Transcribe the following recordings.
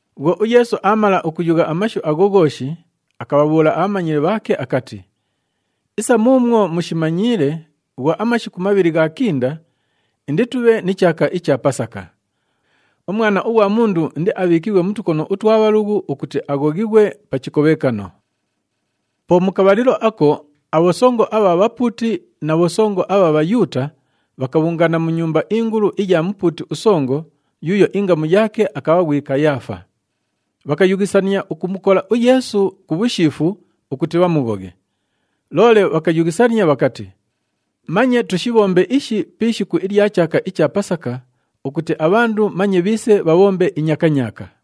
Bhwo uYeesu aamala ukuyugha amashu agho ghooshi, akabhabhuula abhamanyili bhaake akati, “Isa muumwo mushimanyiile, bhwo amashiku mabhili ghaakinda, inditubhe ni chaaka icha Pasaka. UMwana ughwa Mundu indiabhiikighwe mu tukono utwa bhalughu ukuti aghoghighwe pa chikobhekano.” Po mu kabhalilo ako, abhosongo abha bhapuuti na bhosongo abha Bhayuuta bhakabhungaana mu nyumba ingulu iya mupuuti usongo yuuyo ingamu yaake akabha ghwi Kayaafa. Bhakayughisania ukumukola uYeesu ku bhushiifu ukuti bhamughoghe. Loole bhakayughisania bhakati, “Manye tushibhombe ishi pi ishiku ilya chaaka icha Pasaka ukuti abhandu manye bhiise bhabhombe inyakanyaaka.”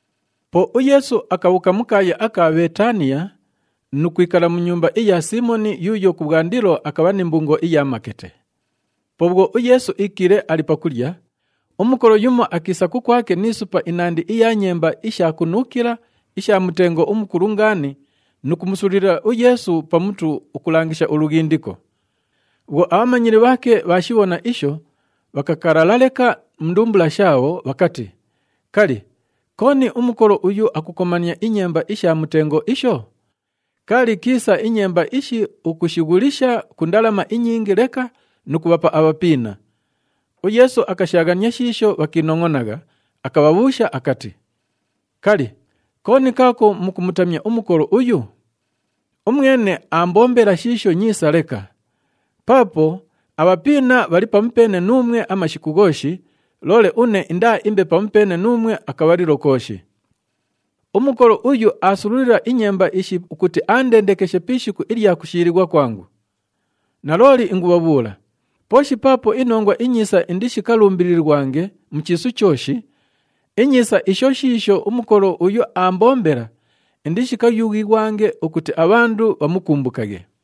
Po uYeesu akabhuuka mu kaaya aka Bheetaniya nu kwikala mu nyumba iya Siimoni yuuyo kubhwandilo akabha ni mbungo iya makete. Po bhwo uYeesu iikiile ali pakulya, umukolo yumo akiisa kukwake ni supa inandi iya nyemba isha kunuukila isha mutengo umukulu ngaani nu kumusululila uYeesu pa mutu ukulangisha ulughindiko. Bhwo abhamanyili bhaake bhaashibhona isho, bhakakalala leka mu ndumbula shaabho bhakati, “Kali, kooni umukolo uyu akukomania inyemba isha mutengo isho? Kaali kiisa inyemba ishi ukushighulisha ku ndalama inyingi leka nu kubhapa abhapiina!” UYeesu akashaaghania shiisho bhakiinongʼonagha, akabhabhuusha akati, “Kali, kooni kaako mukumutamya umukolo uyu? Umwene aambombela shiisho nyiisa leka. Paapo abhapiina bhali pamupeene nuumwe amashiku ghooshi, loole une indaaimbe pamupeene nuumwe akabhalilo kooshi. Umukolo uyu aasululila inyemba ishi ukuti aandendekeshe pi ishiku ilya kushiilighwa kwangu. Nalooli ingubhabhuula, pooshi paapo iNongwa iNyiisa indishikalumbililighwange mu chiisu chooshi, inyiisa isho shiisho umukolo uyu aambombela, indishikayughighwange ukuti abhandu bhamukumbukaghe.”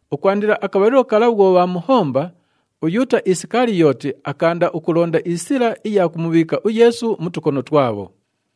Ukwandila akabhalilo kala bhwo bhaamuhomba, uYuuta Isikaliyooti akaanda ukulonda isila iya kumubhiika uYeesu mu tukono twabho.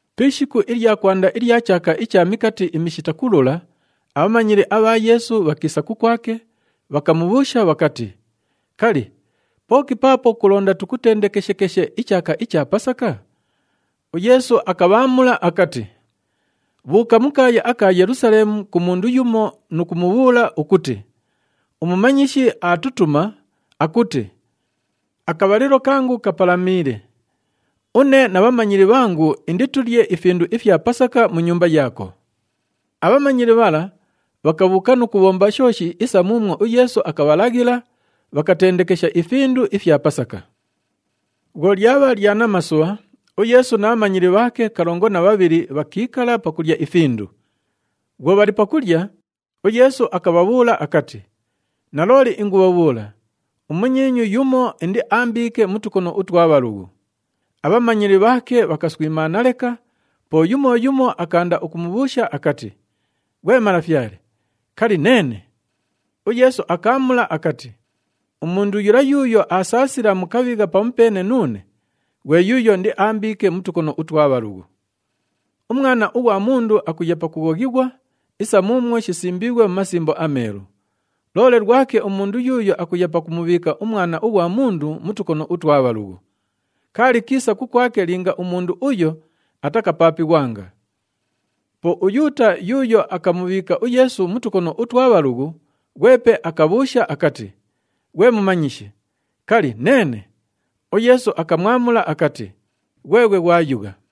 Pi ishiku ilya kwanda ilya chaaka icha Mikati iMishita Kulula, abhamanyili abha Yeesu bhakiisa kukwake, bhakamubhuusha bhakati, “Kali, pooki paapo kulonda tukutendekeshekeshe ichaaka icha Pasaka?” UYeesu akabhaamula akati, “Bhuuka mu kaaya aka Yelusaleemu ku mundu yumo nu kumubhuula ukuti, uMumanyishi aatutuma, akuti, ‘Akabhalilo kangu kapalamiile. Une na bhamanyili bhangu inditulye ifindu ifya Pasaka mu nyumba yaako.’” Abhamanyili bhala bhakabhuuka nu kubhomba shooshi isa muumwo uYeesu akabhalaghila, bhakatendekesha ifindu ifya Pasaka. Bhwo lyabha lya namasubha, uYeesu na bhamanyili bhaake kalongo na bhabhili bhakiikala pakulya ifindu. Bhwo bhali pakulya, uYeesu akabhabhuula akati, “Nalooli ingubhabhuula, umunyiinyu yumo indiaambiike mu tukono utwa bhalughu.” Abhamanyili bhaake bhakaswimaana leka, po yumo yumo akaanda ukumubhuusha akati, “Ghwe Malafyale, kali, neene?” UYeesu akaamula akati, “Umundu yula yuuyo aasaasila mu kabhigha pamupeene nuune, ghwe yuuyo indiaambiike mu tukono utwa bhalughu. UMwana ughwa Mundu akuya pakughoghighwa isa muumwo shisimbiighwe mu Masimbo aMeelu. Loole lwake umundu yuuyo akuya pakumubhiika uMwana ughwa Mundu mu tukono utwa bhalughu. Kaali kiisa kukwake linga umundu uyo atakapaapighwanga!” Po uYuuta yuuyo akamubhiika uYeesu mu tukono utwa bhalughu, ghwepe akabhuusha akati, “Ghwe Mumanyishi, kali, neene?” UYeesu akamwamula akati, “Ghweghwe ghwayugha.”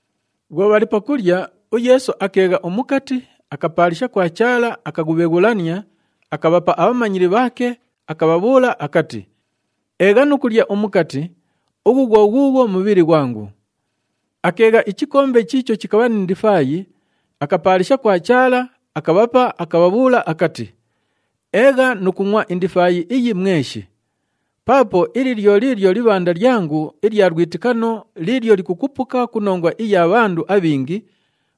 Bhwo bhali pakulya, uYeesu akeegha umukati, akapaalisha kwa Chaala, akaghubheghulania, akabhapa abhamanyili bhaake, akabhabhuula akati, “Eegha nu kulya umukati, ughu ghwo ghuughwo mubhili ghwangu.” Akeegha ichikombe chiicho chikabha ni ndifaayi, akapaalisha kwa Chaala, akabhapa, akabhabhuula akati, “Eegha nu kungʼwa indifaayi iyi mweshi. Paapo ili lyo liilyo libhanda lyangu ilya lwitikano liilyo likukupuka ku nongwa iya bhandu abhingi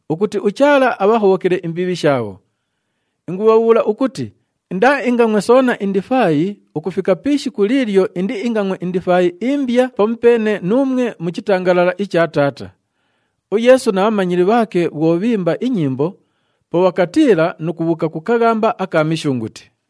ukuti uChaala abhahobhokele imbiibhi shaabho. Ingubhabhuula ukuti indaaingangʼwe soona indifaayi ukufika pi ishiku liilyo indiingangʼwe indifaayi imbya pamupeene nuumwe mu chitangalala icha Taata.” UYeesu na bhamanyili bhaake bhwo bhiimba inyimbo, po bhakatiila nu kubhuuka ku kaghamba aka Mishunguti.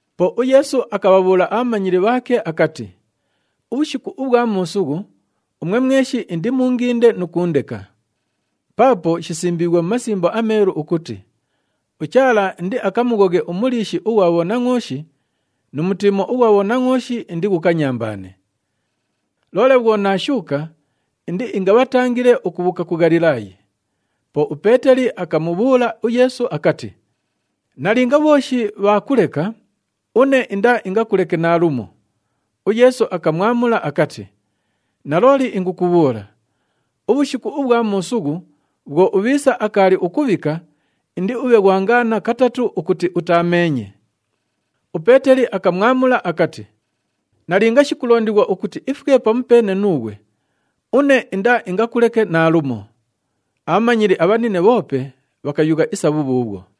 Po uYeesu akabhabhuula abhamanyili bhaake akati, “Ubhushiku ubhwa muusughu, umwe mweshi indimuunginde nu kuundeka. Paapo shisimbiighwe mu Masimbo aMeelu ukuti, ‘UChaala indiakamughoghe umuliishi ughwa bhonangʼooshi, nu mutiimo ughwa bhonangʼooshi indighukanyambaane.’ Loole bhwo naashuuka, indiingabhatangile ukubhuuka ku Ghalilaayi.” Po uPeeteli akamubhuula uYeesu akati, “Nalinga bhooshi bhaakuleka, une indaaingakuleke naalumo!” UYeesu akamwamula akati, “Nalooli ingukubhuula, ubhushiku ubhwa muusughu bhwo ubhiisa akaali ukubhika, indiubhe ghwangaana katatu ukuti utaameenye.” UPeeteli akamwamula akati, “Nalinga shikulondighwa ukuti ifwe pamupeene nuughwe, une indaaingakuleke naalumo!” Abhamanyili abhanine bhoope bhakayugha isa bhubhuubhwo.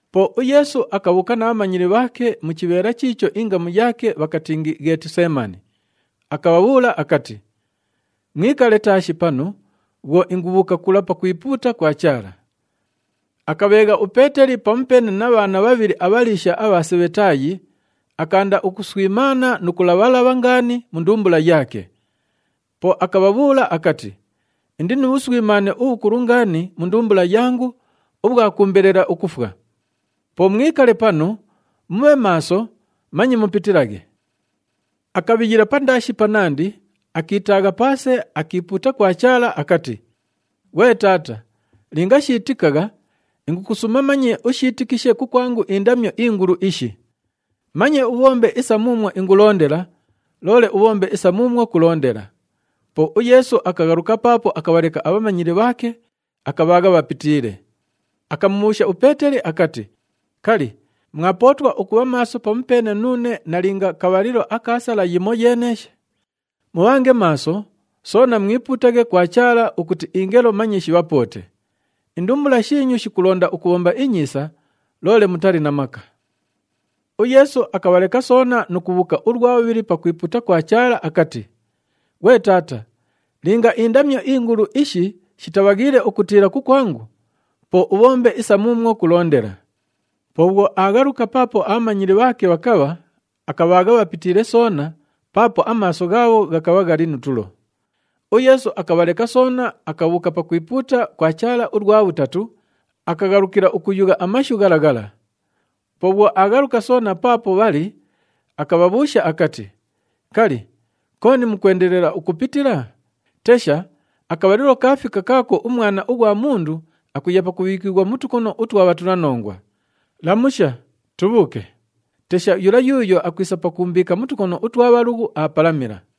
Po uYeesu akabhuuka na bhamanyili bhaake mu chibheela chiicho ingamu yaake bhakatingi, Ghetiseemani, akabhabhuula akati, “Mwikale taashi panu bhwo ingubhuuka kula pakwipuuta kwa Chaala.” Akabheegha uPeeteli pamupeene na bhaana bhabhili abhaliisha abha Sebhetaayi, akaanda ukuswimaana nu kulabha-labha ngaani mu ndumbula yaake. Po akabhabhuula akati, “Indi nu bhuswimaane ubhukulu ngaani mu ndumbula yangu ubhwa kuumbelela ukufwa. Po mwikale panu, mubhe maaso, manye mupitilaghe.” Akabhiyila pandaashi panandi, akiitaagha paase, akiipuuta kwa Chaala akati, “Ghwe Taata, linga shiitikagha, ingukusuuma manye ushiitikishe kukwangu indamyo ingulu ishi! Manye ubhombe isa muumwo ingulondela, loole ubhombe isa muumwo kulondela.” Po uYeesu akaghaluka paapo akabhaleka abhamanyili bhaake, akabhaagha bhapitiile. Akamubhuusha uPeeteli akati, “Kali, mwapootwa ukubha maaso pamupeene nuune nalinga kabhalilo aka sala yimoyeeneeshe? Mubhange maaso, soona mwipuutaghe kwa Chaala ukuti ingelo manye shibhapoote. Indumbula shiinyu shikulonda ukubhomba inyiisa, loole mutali na maka.” UYeesu akabhaleka soona nu kubhuuka ulwa bhubhili pakwipuuta kwa Chaala akati, “Ghwe Taata, linga indamyo ingulu ishi shitabhaghiile ukutiila kukwangu, po ubhombe isa muumwo kulondela.” Po bhwo aaghaluka paapo abhamanyili bhaake bhakabha, akabhaagha bhapitiile soona, paapo amaaso ghaabho ghakabha ghali nu tulo. UYeesu akabhaleka soona, akabhuuka pakwipuuta kwa Chaala ulwa bhutatu, akaghalukila ukuyugha amashu ghala ghala. Po bhwo aaghaluka soona paapo bhali, akabhabhuusha akati, “Kali, kooni mukwendelela ukupitila? Tesha, akabhalilo kaafika kaako uMwana ughwa Mundu akuya pakubhiikighwa mu tukono utwa bhatulanongwa. Lamusha! Tubhuuke. Tesha, yula yuuyo akwisa pakuumbiika mu tukono utwa bhalughu, aapalamila!”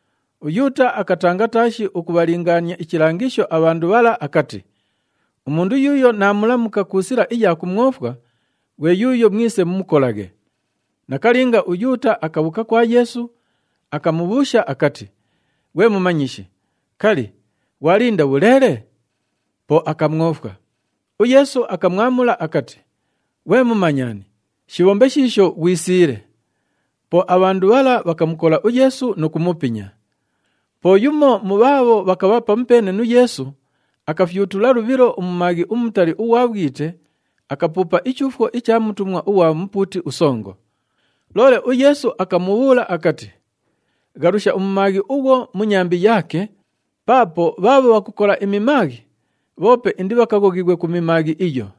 UYuuta akatanga taashi ukubhalingaania ichilangisho abhandu bhala akati, “Umundu yuuyo naamulamuka ku sila iya kumwofwa, ghwe yuuyo mwise mumukolaghe.” Nakalinga, uYuuta akabhuuka kwa Yeesu, akamubhuusha akati, “Ghwe Mumanyishi, kali, ghwalinda bhuleele?” Po akamwofwa. UYeesu akamwamula akati, “Ghwe mumanyani, shibhombe shiisho ghwisiile.” Po abhandu bhala bhakamukola uYeesu nu kumupinya. Po yumo mu bhaabho bhakabha pamupeene nu Yeesu, akafyutula lubhilo umumaaghi umutali ughwa bhwite, akapuupa ichuufwo icha mutumwa ughwa mupuuti usongo. Loole uYeesu akamubhuula akati, “Ghalusha umumaaghi ughwo mu nyambi yaake, paapo bhaabho bhakukola imimaaghi, bhoope indibhakaghoghighwe ku mimaaghi iyo!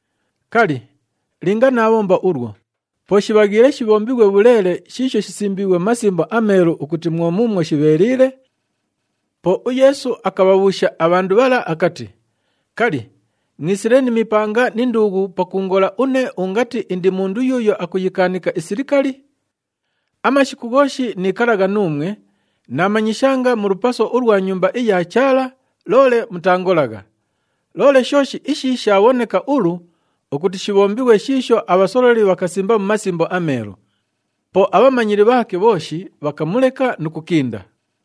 Kali, linga naabhomba ulwo, po shibhaghiile shibhombighwe bhuleele shiisho shisimbiighwe mu Masimbo aMeelu ukuti mwo muumwo shibheeliile?” Po uYeesu akabhabhuusha abhandu bhala akati, “Kali, mwisile ni mipanga ni nduughu pakuungola une ungati indi mundu yuuyo akuyikaanika isilikali? Amashiku ghooshi niikalagha nuumwe, naamanyishanga mu lupaso ulwa Nyumba iya Chaala, loole mutaangolagha. Loole shooshi ishi shaabhoneka ulu ukuti shibhombighwe shiisho abhasololi bhakasimba mu Masimbo aMeelu.” Po abhamanyili bhaake bhooshi bhakamuleka nu kukinda.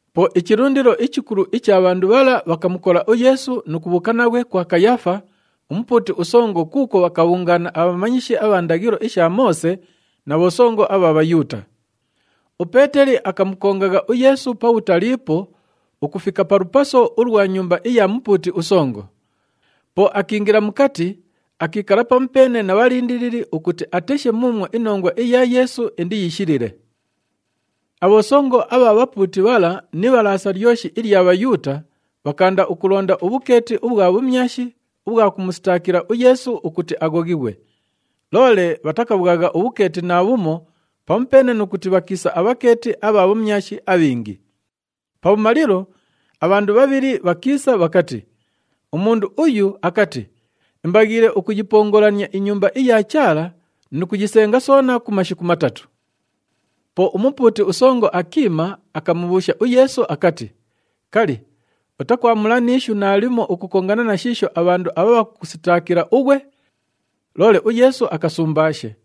Po ichilundilo ichikulu icha bhandu bhala bhakamukola uYeesu nu kubhuuka naghwe kwa Kayaafa, umupuuti usongo kuukwo bhakabhungaana abhamanyishi abha ndaghilo isha Moose na bhosongo abha Bhayuuta. UPeeteli akamukongagha uYeesu pabhutaliipo ukufika pa lupaso ulwa nyumba iya mupuuti usongo. Po akiingila mukati, akiikala pamupeene na bhalindilili ukuti ateshe muumwo inongwa iya Yeesu indiyishilile. Abhosongo abha bhapuuti bhala ni Ibhalaasa lyoshi ilya Bhayuuta, bhakaanda ukulonda ubhukeeti ubhwa bhumyashi ubhwa kumusitaakila uYeesu ukuti aghoghighwe. Loole bhatakabhwagha ubhukeeti naabhumo pamupeene nu kuti bhakiisa abhakeeti abha bhumyashi abhingi. Pabhumalilo, abhandu bhabhili bhakiisa bhakati, “Umundu uyu akati, ‘Imbaghiile ukuyipongolania iNyumba iya Chaala nu kuyisenga soona ku mashiku matatu.’” Po umupuuti usongo akiima, akamubhuusha uYeesu akati, “Kali, utakwamula ni ishu naalimo ukukongana na shiisho abhandu abha bhakukusitaakila ughwe?” Loole uYeesu akasumbaashe.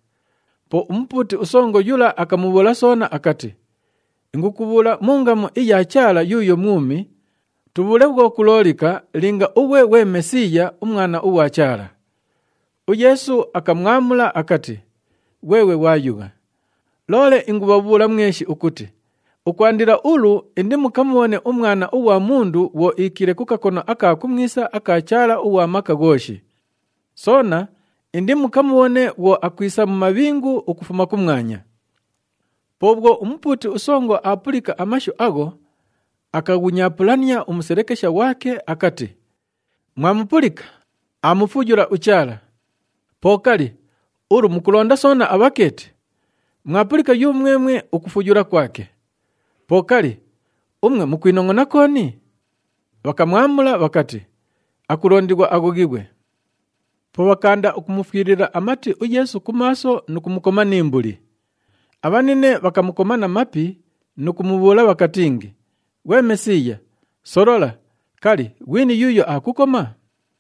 Po umupuuti usongo yula akamubhuula soona akati, “Ingukubhuula mu ngamu iya Chaala yuuyo mwumi, tubhuule bhwo kuloolika, linga ughwe ghwe Mesiiya, uMwana ughwa Chaala.” UYeesu akamwamula akati, “Ghweghwe ghwayugha. Loole ingubhabhuula mweshi ukuti ukwandila ulu indimukamubhone uMwana ughwa Mundu bhwo iikiile ku kakono aka kumwisa aka Chaala ughwa Maka Ghooshi. Soona indimukamubhone bhwo akwisa mu mabhingu ukufuma kumwanya.” Po bhwo umupuuti usongo aapulika amashu agho, akaghunyaapulania umuselekesha ghwake akati, “Mwamupulika, aamufuyula uChaala! Po kali, ulu mukulonda soona abhakeeti? Mwapulika yumwemwe ukufuyula kwake! Po kali, umwe mukwinongʼona kooni?” Bhakamwamula bhakati, “Akulondighwa aghoghighwe!” Po bhakaanda ukumufwilila amati uYeesu ku maaso nu kumukoma ni mbuli. Abhanine bhakamukoma na mapi nu kumubhuula bhakatingi, “Ghwe Mesiiya, solola, kali, ghwini yuuyo aakukoma?”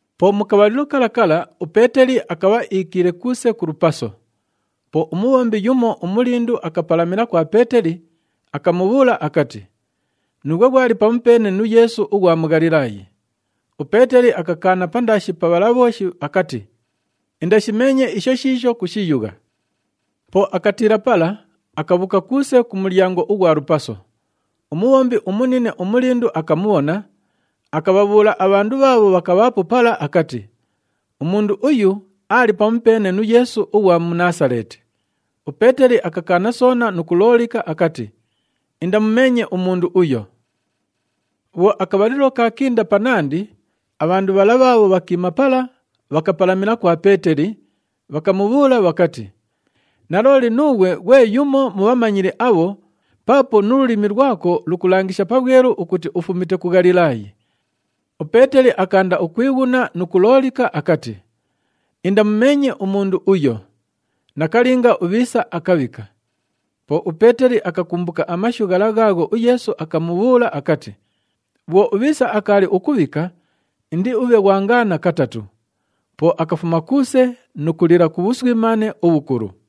Po mu kabhalilo kala kala uPeeteli akabha iikiile kuuse ku lupaso. Po umubhombi yumo umulindu akapalamila kwa Peeteli, akamubhuula akati, “Nuughwe ghwali pamupeene nu Yeesu ughwa mu Ghalilaayi.” UPeeteli akakaana pandaashi pa bhala bhooshi akati, “Indashimeenye isho shiisho kushiyugha!” Po akatiila pala, akabhuuka kuuse ku mulyango ughwa lupaso. Umubhombi umunine umulindu akamubhona, akabhabhuula abhandu bhaabho bhakabhaapo pala akati, “Umundu uyu aali pamupeene nu Yeesu ughwa mu Naasaleeti.” UPeeteli akakaana soona nu kuloolika akati, “Indamumeenye umundu uyo!” Bhwo akabhalilo kaakinda panandi, abhandu bhala bhaabho bhakiima pala, bhakapalamila kwa Peeteli, bhakamubhuula bhakati, “Nalooli nuughwe ghwe yumo mu bhamanyili abho paapo nu lulimi lwako lukulangisha pabhwelu ukuti ufumite ku Ghalilaayi!” UPeeteli akaanda ukwighuna nu kuloolika akati, “Indamumeenye umundu uyo!” Nakalinga, ubhiisa akabhika. Po uPeeteli akakumbuka amashu ghala ghaagho uYeesu akamubhuula akati, “Bhwo ubhiisa akaali ukubhika, indiubhe ghwangaana katatu.” Po akafuma kuuse nu kulila ku bhuswimaane ubhukulu.